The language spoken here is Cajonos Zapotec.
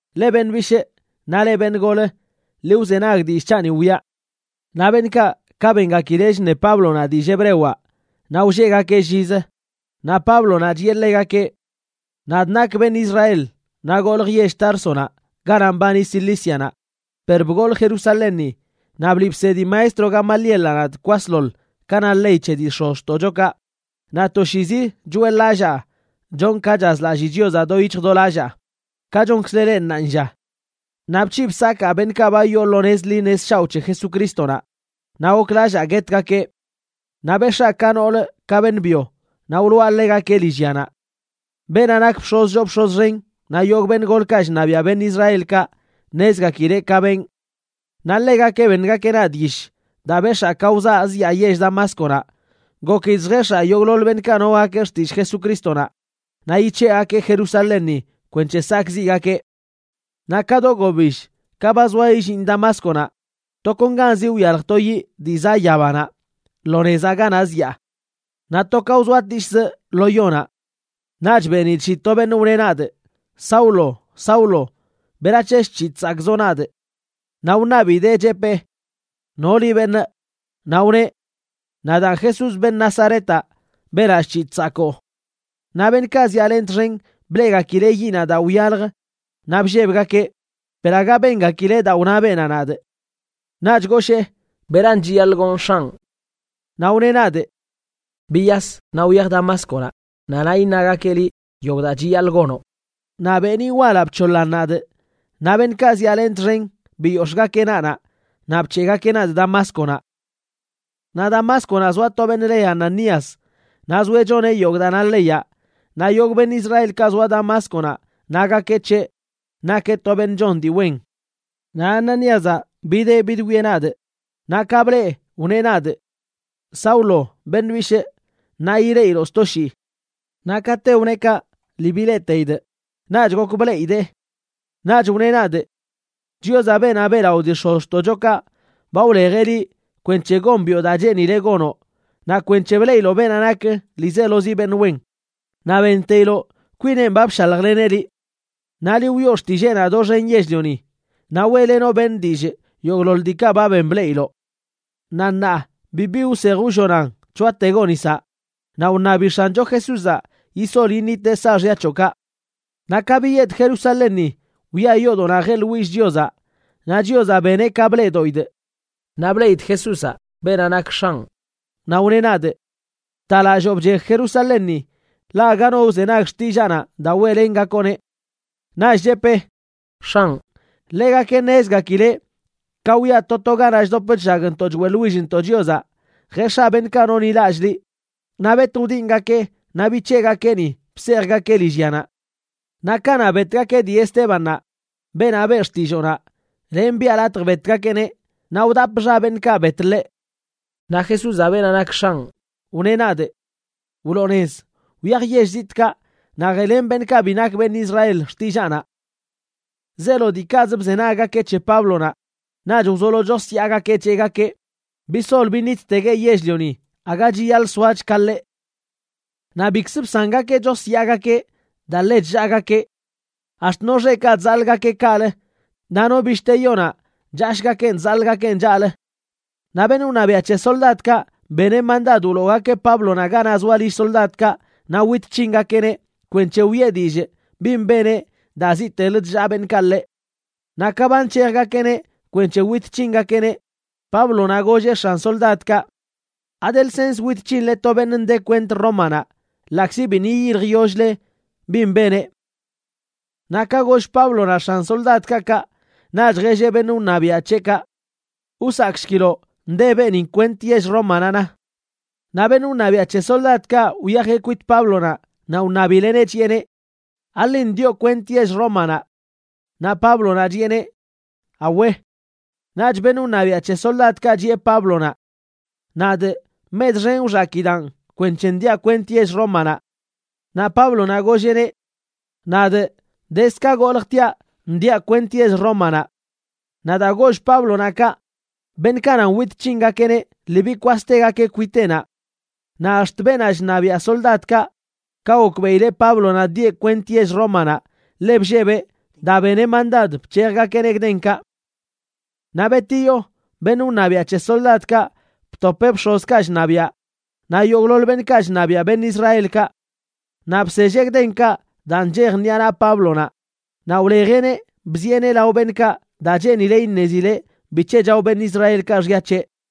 ―Leꞌ beṉꞌ bishꞌ, naꞌ leꞌ beṉꞌ gol, ḻi wzenag dillꞌ c̱haꞌni wiꞌa. Naꞌ beṉꞌkaꞌ, ka bengakileꞌ chṉe Páblonaꞌ dillꞌ hebrewaꞌ naꞌ wlleꞌgakeꞌ llizə. Naꞌ Páblonaꞌ chiꞌe ḻegakeꞌ: ―Nadꞌ nakꞌ beṉꞌ Israel naꞌ goljꞌ yell Társonaꞌ ganaꞌ mbani Cilícianaꞌ, per bgolꞌ Jerusalénni, naꞌ bliꞌ bsedi maestro Gamalielaꞌ nadꞌ kwasḻoḻ ka na ley c̱he dii x̱ozxtoꞌchokaꞌ, naꞌ toshiizi choeꞌḻ-lallaa chonꞌ ka chazlallꞌ Chiozaꞌ do yic̱hj do lallaa, ka chonkzle leꞌ ṉaanlla. Naꞌ bc̱hiꞌ bsakaa beṉꞌkaꞌ ba wyoo lo nez ḻi nez shaoꞌ c̱he Jesucrístonaꞌ naꞌ goklallaa guetgakeꞌ. Naꞌ bex̱aa ka nool ka beṉꞌ byo, naꞌ wloꞌa ḻegakeꞌ lillyanaꞌ. Beenaꞌ nak bx̱oz choo bx̱oz xen naꞌ yogꞌ beṉꞌ golkaꞌ chṉabiaꞌ beṉꞌ Israelkaꞌ ṉezgakileꞌ ka benꞌ. Naꞌ ḻegakeꞌ beṉgakeꞌ nadꞌ yish daa bex̱aa ka wzaa zyaa yell Damásconaꞌ, gokidꞌ lljex̱aa yogꞌḻoḻ beṉꞌkaꞌ nogakeꞌ xtillꞌ Jesucrístonaꞌ naꞌ yic̱heꞌgakee Jerusalénni kwenc̱he sakꞌziꞌgakeꞌ. ’Naꞌ ka do gobill, ka ba zoa illinꞌ Damásconaꞌ, tokonganzi wyalj to yiꞌ dii zaꞌ yabanaꞌ lo nezaꞌ ganaꞌ zyaa. Naꞌ to wzoatishzꞌ lo yonaꞌ. Naꞌch benidꞌ shii to beṉꞌ wneꞌ nadꞌ: “Saulo, Saulo, ¿berac̱he chc̱hiꞌ chsakꞌzoꞌ nadꞌ?” Naꞌ wṉabidee, chepee: “¿No liꞌ, beṉꞌ?” Naꞌ wneꞌ: “Nadaan Jesús, beṉꞌ Nazaretaꞌ, beenaꞌ chc̱hiꞌ chsakoo.” Naꞌ beṉꞌkaꞌ zyaalenꞌ txen bleꞌgakileꞌ yiꞌnaꞌ daa wyalj naꞌ bllebgakeꞌ, per aga bengakileꞌ daa wna beenaꞌ nadꞌ. Naꞌch goshee: “¿Beran chiyaḻꞌ gonꞌ, X̱anꞌ?” Naꞌ wneꞌ nadꞌ: “Biyas naꞌ wyaj Damásconaꞌ, naꞌ naꞌ iṉagakeꞌ liꞌ yogꞌ daa chiyaḻꞌ gonoꞌ.” Naꞌ beeniꞌ walaꞌ bc̱hoḻan nadꞌ, naꞌ beṉꞌkaꞌ zyaalenꞌ txen biyox̱ꞌgakeꞌ naꞌnaꞌ naꞌ bc̱heꞌgakeꞌ nadꞌ Damásconaꞌ. ’Naꞌ Damásconaꞌ zoa to beṉꞌ le Ananías, naꞌ zoeꞌ choneꞌ yogꞌ daa na leyaꞌ, naꞌ yogꞌ beṉꞌ Israelkaꞌ zoa Damásconaꞌ nagakeꞌ c̱heꞌ nakeꞌ to beṉꞌ chon dii wen. Naꞌ Ananíazaꞌ bideꞌ bidwieꞌ nadꞌ, naꞌ ka blee, wneꞌ nadꞌ: “Saulo, beṉ bishꞌ, ṉaa yileꞌiloꞌ sto shii.” Naꞌ kate wneꞌ kaꞌ, lii bileꞌteidꞌ, naꞌch gok bleꞌidee. Naꞌch wneꞌ nadꞌ: “Chiozaꞌ, beenaꞌ beꞌlaꞌo dii x̱ozxtoꞌchokaꞌ, ba wlejeꞌ liꞌ kwenc̱he gombiꞌo daa cheenileꞌ gonoꞌ, naꞌ kwenc̱he bleꞌiloꞌ beenaꞌ nak ḻiizelozi beṉꞌ wen, naꞌ benteiloꞌ kwineꞌn ba bshaljleneꞌ liꞌ. Naꞌ liꞌ wiꞌo xtilleenaꞌ doxen yell-lioni, naꞌ weꞌlenoꞌ beṉꞌ dillꞌ yogꞌḻoḻ diikaꞌ ba ben bleꞌiloꞌ. Naꞌ ṉaa, bibi wsej wllonan c̱hoategoꞌ nisaꞌ naꞌ wṉabi X̱ancho Jesúzaꞌ yisol yiṉiteꞌ saaxya c̱hoꞌkaꞌ.” ’Naꞌ ka biyedꞌ Jerusalénni, wyaa yoodoꞌnaꞌ jeꞌḻwillꞌ Chiozaꞌ, naꞌ Chiozaꞌ beneꞌ ka bleꞌdoꞌidꞌ. Naꞌ bleꞌidꞌ Jesúzaꞌ, beenaꞌ nak X̱anꞌ, naꞌ wneꞌ nadꞌ: “Btalalloo bchej Jerusalénni, ḻaꞌ aga no wzenag xtillaanaꞌ daa weꞌlengakoꞌneꞌ.” Naꞌch chepee: “X̱anꞌ, ḻegakeꞌ ṉezgakileꞌ ka wyaꞌ to to ganaꞌ chdop chllagntoꞌ choeꞌḻwillntoꞌ Chiozaꞌ jex̱aa beṉꞌkaꞌ nonḻilallꞌ liꞌ, naꞌ bet wdingakee naꞌ bic̱heꞌgakee ni, bsejgakee lillyanaꞌ. Naꞌ kanaꞌ betgakeꞌ dii Estébannaꞌ beenaꞌ beꞌ xtilloonaꞌ, lenꞌ biꞌa latj betgakeꞌneꞌ, naꞌ wdapꞌ xa beṉꞌkaꞌ bet ḻeꞌ.” Naꞌ Jesúzaꞌ, beenaꞌ nak X̱anꞌ, wneꞌ nadꞌ: “Wloo nez, wyaj yell zitꞌkaꞌ naꞌ jeꞌlen beṉꞌkaꞌ bi nak beṉꞌ Israel xtillaanaꞌ.” Zeelo diikaꞌz bzenaggakeꞌ c̱he Páblonaꞌ, naꞌch wzolo chosyaagakeꞌ cheꞌgakeꞌ: ―¡Bisol biṉittegueꞌ yell-lioni! ¡Aga chiyaḻꞌ soach ka ḻeꞌ! Naꞌ bikzə bsangakeꞌ chosyaagakeꞌ daa ḻe chllaagakeꞌ. Ax̱t no xeꞌkaꞌ chzaḻꞌgakeꞌ kaꞌlə naꞌ no bishte yonaꞌ chashgakeꞌn chzaḻꞌgakeꞌn chaꞌlə. Naꞌ beṉꞌ wṉabiaꞌ c̱he soldadkaꞌ beneꞌ mandad wloogakeꞌ Páblonaꞌ ganaꞌ zoa lill soldadkaꞌ naꞌ wit c̱hingakeꞌneꞌ kwenc̱he wiꞌe dillꞌ bin beneꞌ daa ziꞌte chllaa beṉꞌkaꞌ ḻeꞌ. Naꞌ ka ba nc̱hejgakeꞌneꞌ kwenc̱he wit c̱hingakeꞌneꞌ, Páblonaꞌ golleꞌ x̱an soldadkaꞌ: ―¿Ade lsens wit c̱hinle to beṉꞌ nde kwent Rómanaꞌ ḻaꞌkzi biṉꞌ yiyiljyoll-le bin beneꞌ? Naꞌ ka goll Páblonaꞌ x̱an soldadkaꞌ kaꞌ, naꞌch jelleꞌ beṉꞌ wṉabiaꞌ c̱heꞌkaꞌ: ―Wsakꞌshkiloꞌ, nde beeni kwent yell Rómanaꞌ, na. Naꞌ beṉꞌ wṉabiaꞌ c̱he soldadkaꞌ wyajeꞌ kwit Páblonaꞌ naꞌ wṉabileꞌneꞌ, chiꞌeneꞌ: ―¿Aḻin ndioꞌ kwent yell Rómanaꞌ? Naꞌ Páblonaꞌ chiꞌeneꞌ: ―Awe. Naꞌch beṉꞌ wṉabiaꞌ c̱he soldadkaꞌ chiꞌe Páblonaꞌ: ―Nadꞌ mech xen wxakidaan kwenc̱he ndiaꞌ kwent yell Rómanaꞌ. Naꞌ Páblonaꞌ golleꞌneꞌ: ―Nadꞌ dezd ka goljtiaꞌ ndiaꞌ kwent yell Rómanaꞌ. Naꞌ daa goll Páblonaꞌ kaꞌ, beṉꞌkaꞌ nan wit c̱hingakeꞌneꞌ lii bikwastegakeꞌ kwiteꞌnaꞌ. Naꞌ ax̱t beenaꞌ chṉabiaꞌ soldadkaꞌ, ka gokbeꞌileꞌ Páblonaꞌ ndieꞌ kwent yell Rómanaꞌ, ḻe bllebeꞌ daa beneꞌ mandad bc̱hejgakeꞌneꞌ gdenkaꞌ. Naꞌ betiyo, beṉꞌ wṉabiaꞌ c̱he soldadkaꞌ btopeꞌ bx̱ozkaꞌ chṉabiaꞌ naꞌ yogꞌḻoḻ beṉꞌkaꞌ chṉabiaꞌ beṉꞌ Israelkaꞌ. Naꞌ bselleꞌ gdenkaꞌ daa nchej ṉiꞌa naꞌ Páblonaꞌ, naꞌ wlejeꞌneꞌ bzieꞌneꞌ lao beṉꞌkaꞌ daa cheenileꞌ iṉezileꞌ bic̱he chao beṉꞌ Israelkaꞌ xya c̱heꞌ.